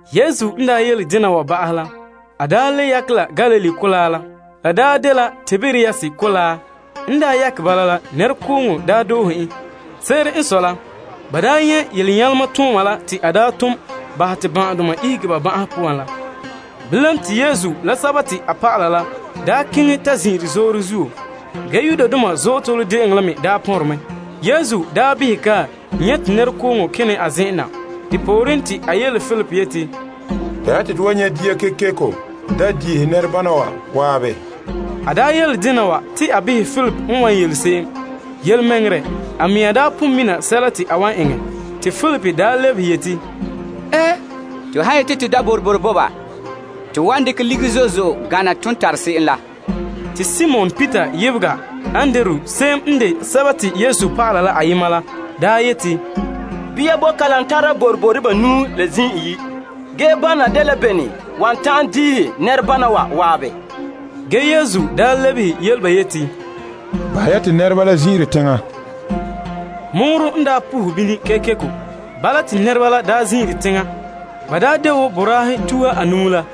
Yesu n daa yele dena wa ba'ahɛ la, a le yakɛ la Galilee mɔgɔrɛ la. La dela Tiberias mɔgɔrɛ. N yakɛ bala la, nɛrekooŋɔ daa doohe en. Se'ere n sɔe la, ba nyɛ' yelenyalema tooma la te a tom bahɛ te ban'ahedoma ihege ba ban'ahe poan la. Bilam, te Yesu la a dɔlɔba la keŋɛ ta zin'ire zoore zuo. Yudoma Azootole De'eŋɔ la me pɔnre mɛ. Yesu behɛ kae nyɛ' te nɛrekooŋɔ kene a zen'en na. Depooren, te a yele Filip yeti, Bɛha te to wan nyɛ' dia kekeko da' diihe nɛrebana wa zan'an? A yele dena wa te a behɛ ya Filip n wan yele se'em. Yelemɛŋɛrɛ, a mea pon mina sɛla te a wan eŋɛ. Te Filip lebehe yeti, To han yeti to da' boroboro bo ba to wan dekɛ ligiri zo'e zo'e gana ton tare se'em la. Te Simon Peter yebega Andrew se'em n de Yesu dɔlɔba la ayema la yeti, Bia boe kalam tara boroboro banuu la zim iyi'. Ge, bana dela bene wan ta'an diihe nɛrebana wa waabe? Ge Yesu lebehe yele ba yeti, Bahɛ ya te nɛreba la zin'ire teŋa. Mɔɔrɔ n pohe bini kekeko. Bala, te nɛreba la daa zin'ire teŋa. Ba de wo boraahe tuha anuu la.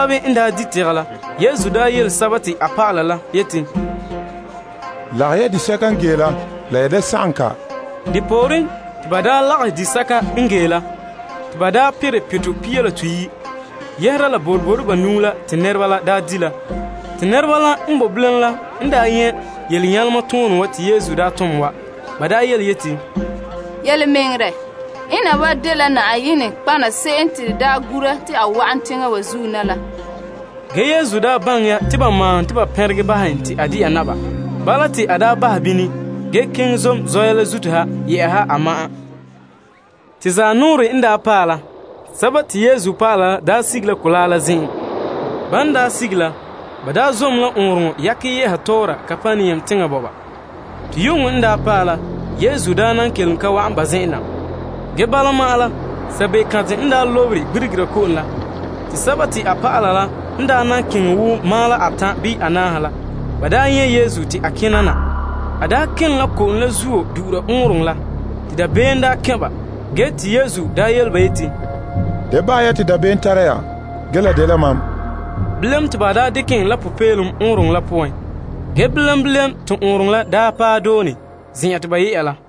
Ba zan'an n di' tegɛ la, Yesu yele a dɔlɔba la yeti, Lagahɛ ya disɛka n gee la, la ya da sagom kɔ. Depooren te ba lagahɛ disɛka n gee la, te la perɛ pitɔ pia la toyi' yɛhera la boroboro banuu la te nɛreba la di' la. Te nɛreba la n boe bilam la n daa nyɛ' yelenyalema toonɛ wa te Yesu daa tom wa, ba yeti, Yelemɛŋɛrɛ, ena wa dela nɔtɔgɔha se'em te to gura te a wa'an teŋa wa zuo na la. Ge Yesu baŋɛ ya te ba maahom te ba pɛnregɛ bahɛ en te a de'a naba. Bala, te a bahɛ bini, ge keŋɛ zom zɔya la zuto ha yɛ'ɛha a ma'an. Te zanɔɔrɛ n daa paɛ la, Yesu dɔlɔba la sige la mɔgɔrɛ la zen'an. Ban daa sige la, ba zom la ɔɔnrɔŋɔ yakɛ ye'a tɔɔra Kapernaum teŋa bɔba. Te yu'uŋɔ n paɛ la, Yesu nan kelom ka wa'an ba zen'en na. Ge bala ma'an la, sabekantɛ lobere gbirigera ko'om la. Te a dɔlɔba la n keŋɛ ta paɛ teŋasoka la, ba nyɛ' Yesu te kena na. A kene la ko'om la zuo kena du'ura ɔɔnrɔŋɔ la, te dabeem kɛn' ba. Ge Yesu daa yele ba yeti, Da bahɛ ya te dabeem tara ya, ge la dela mam. Bilam, te ba tare en la popeelom ɔɔnrɔŋɔ la poan. Ge bilam bilam, te ɔɔnrɔŋɔ la paɛ doone, zen'en te ba ye'a la.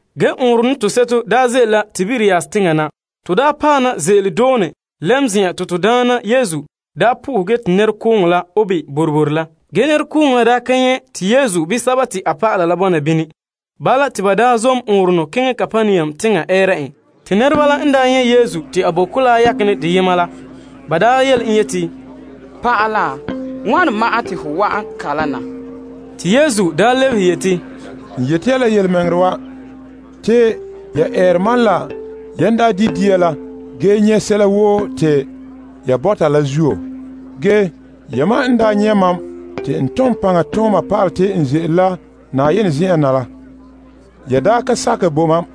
Ge ɔɔnrɔnɔ toseto ze'ele la Tiberias teŋa na. To paɛ na ze'ele la doone lɛm zen'an te to Daana Yesu zam po'ohɛ, ge te nɛrekooŋɔ la obe boroboro la. Ge nɛrekooŋɔ la ka nyɛ' te Yesu bii a dɔlɔba la bɔna bini. Bala, te ba zom ɔɔnrɔnɔ keŋɛ Kapernaum teŋa ɛɛra en. Te nɛreba la n nyɛ' Yesu te a boe mɔgɔrɛ la yakenɛ deyema la, ba yele en yeti, Naa, wane ma'an te hon wa'an kalam na? Te Yesu lebehe yeti, N yeti ya la yelemɛŋɛrɛ wa, te ya eere mam la yan di' dia la ge nyɛ' sɛla woo te ya bɔta la zuo. La yan pon nyɛ' mam te tom paŋa tooma pa'ala te n ze'ele la Yenɛ zen'en na, ya da ka sakɛ bo mam.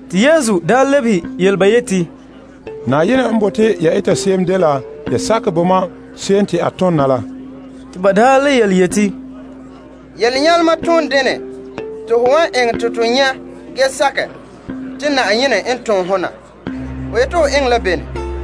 Te Yesu lebehe yele ba yeti, Na'ayenɛ n bote ya eta se'em dela ya sakɛ bo mam se'em te a tom na la. Te ba le yeti, Yelenyalema toon dene te ho wan eŋɛ te to nyɛ' ge sakɛ te Na'ayenɛ n tom ho na? Ho yeti ho eŋɛ la bene?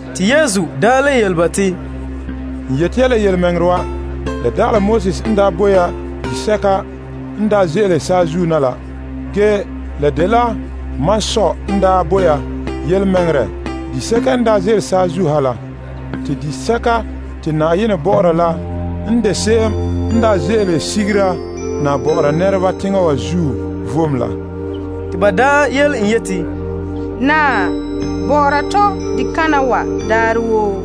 Te Yesu le yele ba te, N yeti ya la yelemɛŋɛrɛ wa, la dagɛ Moses n daa bo ya disɛka n daa ze'ele saazuo na la. Ge, la dela mam Sɔ n bo ya yelemɛŋɛrɛ disɛka n ze'ele saazuo ha la. Te disɛka te Na'ayenɛ bɔ'ɔra la n de se'em n ze'ele sigere na bɔ'ɔra nɛreba teŋa wa zuo vom la. Te ba daa yele en yeti, Naa, bɔ'ɔra tɔ dikana wa daarɛ woo.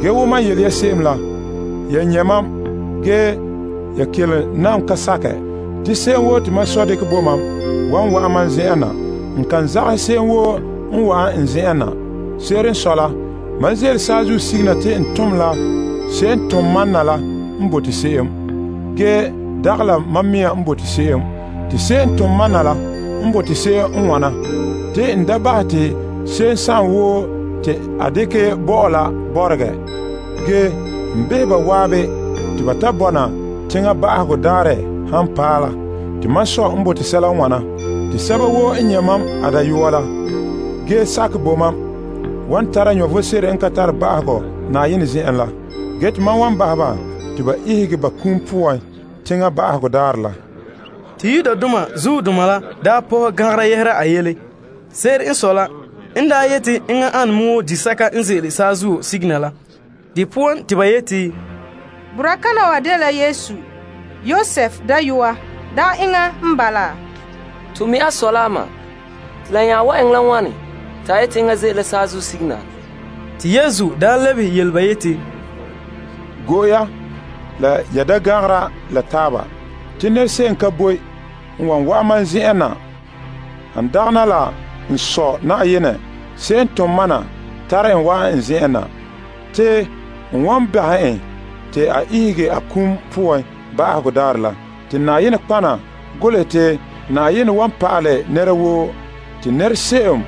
Ge wo mam yele ya se'em la, ya nyɛ' mam, ge ya kelom nan ka sakɛ. Te se'em woo te mam Sɔ dekɛ bo mam wan wa'an mam zen'en na. N kan zagahɛ se'em woo n wa'an n zen'en na. Se'ere n sɔe la, mam ze'ele saazuo sige na te n tom la se'em n tom mam na la sunboolom, ge dagɛ la n mea sunboolom. Te se'em n tom mam na la sunboolom n wana, te n da bahɛ te se'em woo te a dekɛ bo mam la bɔregɛ. Ge, n behɛ ba zan'an te ba ta bɔna teŋa ba'ahegɔ daarɛ han paɛ la. Te mam Sɔ sunboolom n wana, te sɛba woo n nyɛ' mam a Dayɔa la, ge sakɛ bo mam, wan tara vom sebo n ka tare ba'ahegɔ Na'ayenɛ zen'en la. Ge te mam wan bahɛ ba te ba ihege ba kum poan teŋa ba'ahegɔ daarɛ la. Te Yudoma la nya pɔhɛ gangara yɛhera a yele. Se'ere n sɔe la, en yeti enŋɛ ana me wo disɛka n ze'ele saazuo sige na la. De poan, te ba yeti, Boraa kana wa dela Yesu, Yosef dayɔa. Dagɛ enŋa n bala? To mi' a sɔ la a ma. Te la nya wan eŋɛ la wane te a yeti enŋa ze'ele la saazuo sige na laa? Te Yesu lebehe yele ba yeti, Go'e ya la ya da gangara la taaba. Te nɛrese'em ka boe wan wa'an mam zen'en na, han dagana la n Sɔ Na'ayenɛ se'em n tom mam na tare en wa'an n zen'en na. Te n wan bahɛ en te a ihege a kum poan ba'ahegɔ daarɛ la. Te nɔtɔgɔha golehɛ te, Na'ayenɛ wan pa'alɛ ho dayɔɔhe yam. Te nɛrese'em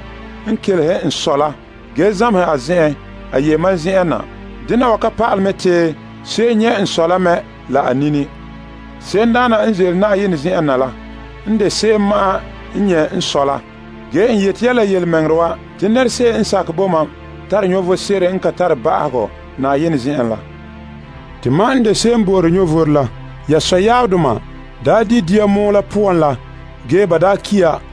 n kelehere n Sɔ la, ge zameha a zen'en, a ye mam zen'en na. Nɛra ka tabelɛ nyɛ' Sɔ la a nini. Se'emdaana n ze'ele Na'ayenɛ zen'en na la n de se'em ma'an n nyɛ' Sɔ la. Ge n yeti ya la yelemɛŋɛrɛ wa, te nɛrese'em n sakɛ bo mam tare vom sebo n ka tare ba'ahegɔ Na'ayenɛ zen'en la. Te mam n de disɛka n bo'ore vom la. Ya sɔyaabdoma daa di' la saazuo dia la pɔgɔtia la poan la, ge ba ki ya.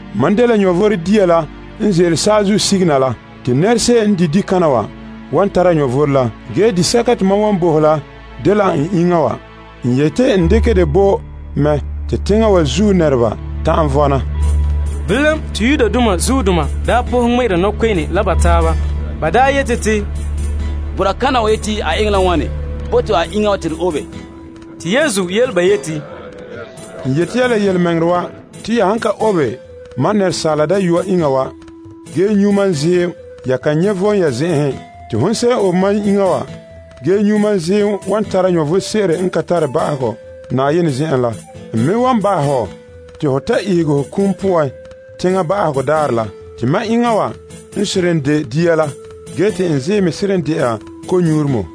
Mam de vom dia la. Te nɛrese'em n di' dikana wa wan tare vom la. Ge disɛka te mam wan bo hɔ la dela n iŋa wa. N yeti n dekɛ dɛ bo mɛ te teŋa wa zuo nɛreba ta'an vɔna. Bilam te Yudoma nya pɔhɛ ŋmɛ'ɛra nɔkpe'ene la taaba. Ba yeti, Boraa kana wa yeti a eŋɛ la wane bo to a iŋa te to obe? Te Yesu yele ba yeti, N yeti ya la yelemɛŋɛrɛ wa. Te ya han ka obe Asaala Dayɔa iŋa wa ge nyu' mam ziim, ya kan nyɛ' vom ya zen'enhen. Te hon se'em n obe mam iŋa wa ge nyu' mam ziim wan tara vom sebo n ka tare ba'ahegɔ Na'ayenɛ zen'en la. N me wan bahɛ hɔ te ho ta ihege ho kum poan teŋa ba'ahegɔ daarɛ la. Te mam iŋa wa n seren de dia la ge te n ziim me seren de'a konyuuremɔ.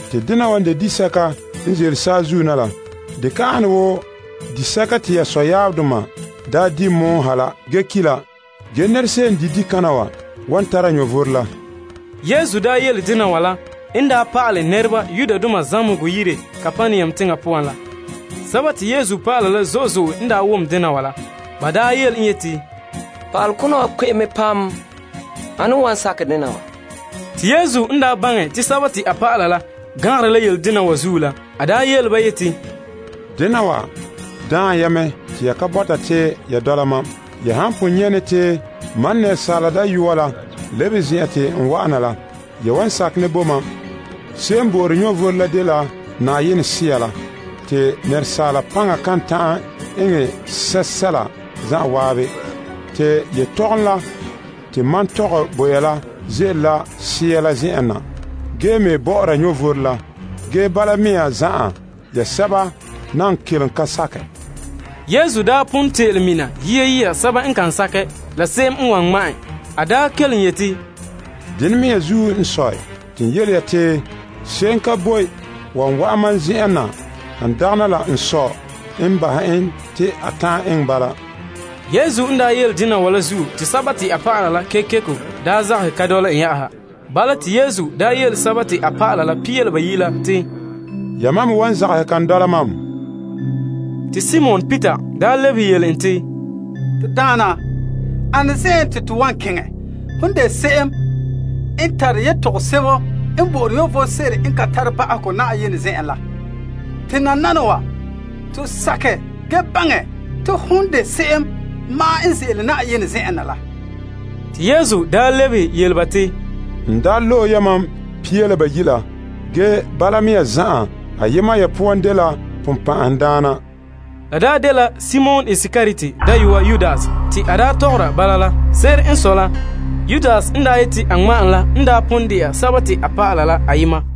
Te dena wa n seren de disɛka n ze'ele saazuo na la. Dɛ ka ane wo disɛka te ya sɔyaabdoma daa di' pɔgɔtia poan ha, ge ki' la. Ge nɛrese'em n di' dikana wa wan vɔna wuuha. Yesu daa yele dena wa la n pa'alɛ nɛreba zamehegɔ yire Kapernaum teŋa poan la. Te Yesu dɔlɔba la zo'e zo'e n wom dena wa la, ba yele en yeti, Pa'alekona wa kpe'em mɛ. Ane n wan bɔkɛ dena wa? Te Yesu n baŋɛ te a dɔlɔba la gangare la yele dena wa zuo la, a yele ba yeti, Dena wa daan ya mɛ te ya ka bɔta te ya dɔla mam? Ge, ya han pon nyɛ' ne te Asaala Dayɔa la lebe zen'an te n wa'ana la, ya wan sakɛ ne bo mam? Se'em n bo'ore vom la dela Na'ayenɛ Sea la. Te asaala paŋa kan ta'an eŋɛ sɛsɛla zan'an. Te yetɔgɔm la te mam tɔgɛ bo ya la ze'ele la Sea la zen'en na, ge me bɔ'ɔra vom la. Ge bala mea zan'an, ya sɛba nan kelom ka sakɛ. Yesu pon te'ele mina sɛba n kan sakɛ, la se'em n wan ŋma' en. A kelom yeti, Dena mea n sɔe, te n yele ya, te se'em ka boe wan wa'an mam zen'en na, han dagana la n Sɔ la n bahɛ en te a ta'an eŋɛ bala. Yesu n daa yele dena wa zuo te a dɔlɔba la kekeko zagahɛ ka dɔla en. Bala, te Yesu yele a dɔlɔba la pia la bayi' la te, Yamam me wan zagahɛ kan dɔla mam? Te Simon Peter lebehe yele en te, To Daana, ane zen'en te to wan keŋɛ? Hon n de se'em n tare yetɔgom sebo n bo'ore vom sebo n ka tare ba'ahegɔ Na'ayenɛ zen'en la. Te nananawa, to sakɛ ge baŋɛ te hon ma'an n de Fa'a Daana la ze'ele Na'ayenɛ zen'en na. Te Yesu lebehe yele ba te, N daa loe yamam pia la bayi' la. Ge bala mea zan'an, ayema ya poan dela Sagona. La dela Simon Iskariot dayɔa Yudas, te a daa tɔgɔra bala la. Se'ere n sɔe la, Yudas n yeti a ŋma' en la n pon de'a a dɔlɔba la ayema la.